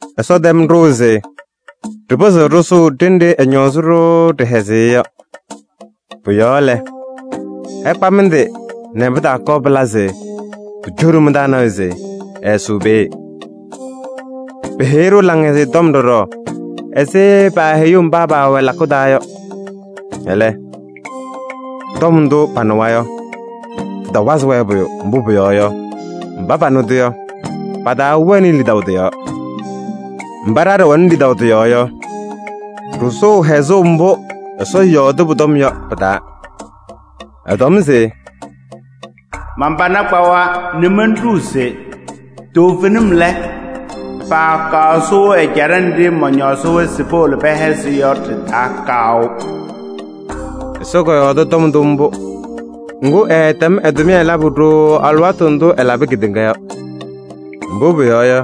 Ɛsɔ tɛm ɖʋʋ se ɖɩpɩzɩɣ ɖɩsʋʋ ɖenɖe ɛñɔɔzɩ-ɖʋ ɖɩhɛzɩyɛ yɔ. Pʋ-yɔɔ lɛ, ɩkpa mɩ-tɩ nɛ pɩtaakɔɔ pɩla se pucoɖi mɩ-taa nɔɔyʋ se ɛɛsʋʋ peeye. Peheyi-ɖʋ Laŋhɛzɩyɛ Tɔm ɖɔɖɔ ɛzɩ paaheyuu mba paawɛ lakʋ taa yɔ. Ɛlɛ, tɔm ndʋ panɩwa yɔ, tɩtawazɩ-wɛ pʋyʋ, mbʋ pʋyɔɔ yɔ, mba panɩ-tʋ yɔ, pataawɛnɩ lidaʋ tɩ-yɔɔ. Mba ɖa ɖɩwɛnɩ lidaʋ tɩ-yɔɔ yɔ, ɖɩsʋʋ hɛzʋʋ mbʋ Ɛsɔ yɔɔdɩ pʋ-tɔm yɔ pɩ-taa. Ɛtɔm se: “Man-pana kpawa nɛ monɖuu se: ‘Toovenim lɛ, paakɔŋ sʋʋ ɛjaɖɛ nɖɩ mɔñɔɔzɩ-wɛ se powolo pɛhɛzɩ yɔ ɖɩ-taa kaʋ.’” Ɛsɔ kɔyɔɔdɩ tɔm ndʋ mbʋ, ŋgʋ, ɛɛtɛm ɛ-tʋmɩyɛ labʋ ɖooo alɩwaatʋ ndʋ ɛɛlabɩ kedeŋa yɔ. Mbʋ pʋyɔɔ yɔ,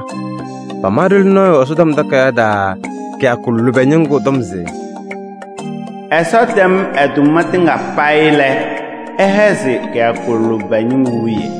pama ɖoli nɔɔyʋ Ɛsɔtɔm Takayaɣ taa kɩyakʋ lʋbɛ ñɩŋgʋ tɔm se: “Ɛsɔ tɛm ɛ-tʋma tɩŋa payɩ lɛ, ɛhɛzɩ kɩyakʋ lʋbɛ ñɩŋgʋ wiye.”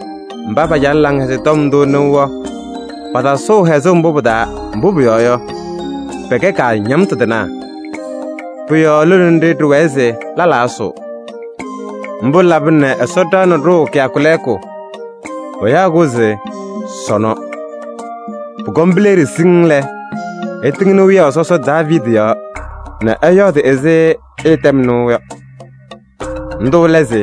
Mba pacalɩ Laŋhɛzɩyɛ Tɔm ndʋ nɩʋ yɔ, patasʋʋ hɛzʋʋ mbʋ pɩ-taa, mbʋ pʋyɔɔ yɔ, pɛkɛ kaañamtʋ tɩnaa. Pʋ-yɔɔ lone nɖɩ ɖɩwɛɛ se lɛlaa ɛsʋʋ. Mbʋ labɩna nɛ Ɛsɔ ɖaɣnɩ ɖʋʋ kɩyakʋ lɛɛkʋ. Payaɣ-kʋ se: “Sɔnɔ.” Pʋkɔm pileɖi siŋŋ lɛ, ɛtɩŋnɩ wiyaʋ sɔsɔ Daaviidi yɔɔ nɛ ɛyɔɔdɩ ɛzɩ ɩtɛm nɩʋ yɔ. Ndʋ lɛ se: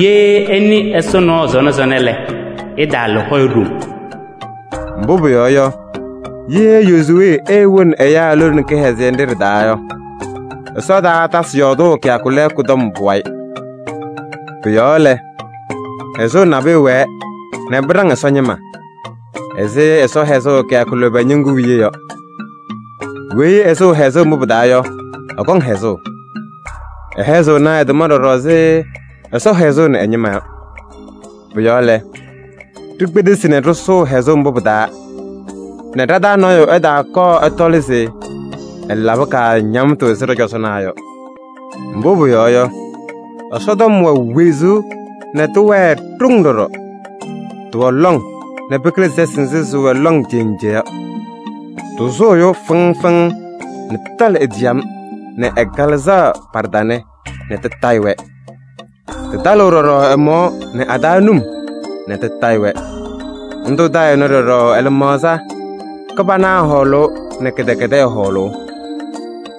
“Ye ɩnɩ Ɛsɔ nɔɔ sɔnɔ sɔnɔ lɛ, ɩtaala hɔyɛ ɖoŋ.” Mbʋ pʋyɔɔ yɔ, ye Yozuwee eewoni ɛyaa lone kɩhɛzɩyɛ nɖɩ ɖɩ-taa yɔ, Ɛsɔ taatasɩ yɔɔdʋʋ kɩyakʋ lɛɛkʋ tɔm pʋwayɩ. Pʋ-yɔɔ lɛ, hɛzʋʋ nabʋyʋ wɛɛ nɛ pɩɖaŋ Ɛsɔ ñɩma ɛzɩ Ɛsɔ hɛzʋʋ kɩyakʋ lʋbɛ ñɩŋgʋ wiye yɔ. Weyi ɛsʋʋ hɛzʋʋ mbʋ pɩ-taa yɔ, ɛkɔŋ hɛzʋʋ. Ɛhɛzɩɣnɩ ɛ-tʋma ɖɔɖɔ ɛzɩ Ɛsɔ hɛzʋʋnɩ ɛ-ñɩma yɔ. Pʋ-yɔɔ lɛ, ɖikpedesi nɛ ɖɩsʋʋ hɛzʋʋ mbʋ pɩ-taa nɛ ɖa-taa nɔɔyʋ ɛtaakɔɔ ɛtɔlɩ se ɛlabɩ kaañamtʋ ɛzɩ ɖɔ-cɔzɔnaa yɔ. Mbʋ pʋyɔɔ yɔ, Ɛsɔtɔm wɛ wezuu nɛ tɩwɛɛ ɖoŋ ɖɔɖɔ. Tɩwɛ lɔŋ nɛ pɩkɩlɩ sɛsɩ nzɩ sɩwɛ lɔŋ cenje yɔ. Tɩsʋʋ ɛyʋ fɩŋ fɩŋ nɛ tɩtalɩ e-ciyam nɛ ɛ-kalɩzaɣ pa-ɖɩtanɛ nɛ tɩtayɩ-wɛ. Tɩtalɩɣ ɖɔɖɔ ɛ-mɔɔ nɛ a-taa num nɛ tɩtayɩ-wɛ. Ndʋ tayɩɣnɩ ɖɔɖɔ ɛ-lɩmaɣza: kɩbana hɔɔlʋʋ nɛ kɩdɛkɛdɛɛ hɔɔlʋʋ.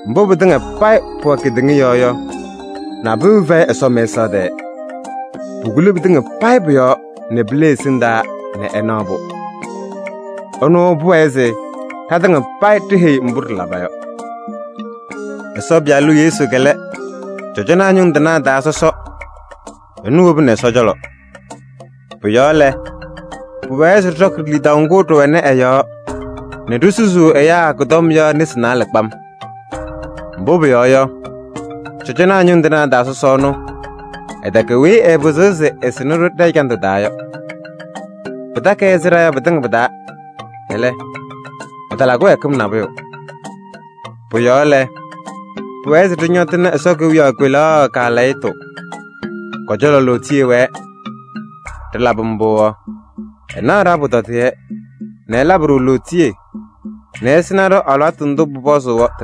Mbʋ pɩtɩŋa payɩ pʋwɛ kedeŋa yɔɔ yɔ, nabʋyʋ fɛyɩ Ɛsɔ mɛsaɣ tɛɛ. Pukuli pɩtɩŋa payɩ pʋ-yɔɔ nɛ pile ɛ-ɛsɩndaa nɛ ɛnaɣ-pʋ. Ɛnʋ pʋwɛɛ se ɖatɩŋa payɩ ɖiheyi mbʋ ɖɩlaba yɔ. Ɛsɔ Pɩyalʋ Yesu lɛ cɔjɔnaa ñʋŋ tɩnaa taa sɔsɔ, ɛnʋ wobini Ɛsɔ cɔlɔ. Pʋ-yɔɔ lɛ, pʋwɛɛ se ɖɩɖɔkɩ lidaʋ ŋgʋ ɖɩwɛnɩ ɛ-yɔɔ nɛ ɖisusuu ɛyaa kʋ-tɔm yɔ nesi naalɛ kpam. Mbʋ pʋyɔɔ yɔ, cɔjɔnaa ñʋŋ tɩnaa taa sɔsɔ ɛnʋ, ɛtɛkɛ weyi ɛɛpɩzɩɣ se ɛsɩnɩ-ɖʋ ɖɛ-ɛjandʋ taa yɔ: pɩtakɩ-ɩ ɛzɩ ɖa yɔ pɩtɩŋa pɩ-taa. Ɛlɛ, ɛtala kɩwɛɛkɩm nabʋyʋ. Pʋ-yɔɔ lɛ, pʋwɛɛ se ɖɩñɔtɩnɩ Ɛsɔ kewiyaɣ kpelaɣ kaalɛyɩtʋ, kɔ-cɔlɔ lootiye wɛɛ. Ɖɩlabɩ mbʋ yɔ, ɛnaɣ ɖa-pʋtɔdɩyɛ nɛ ɛlabɩ-ɖʋ lootiye nɛ ɛsɩnɩ-ɖʋ alɩwaatʋ ndʋ pʋpɔzʋʋ yɔ.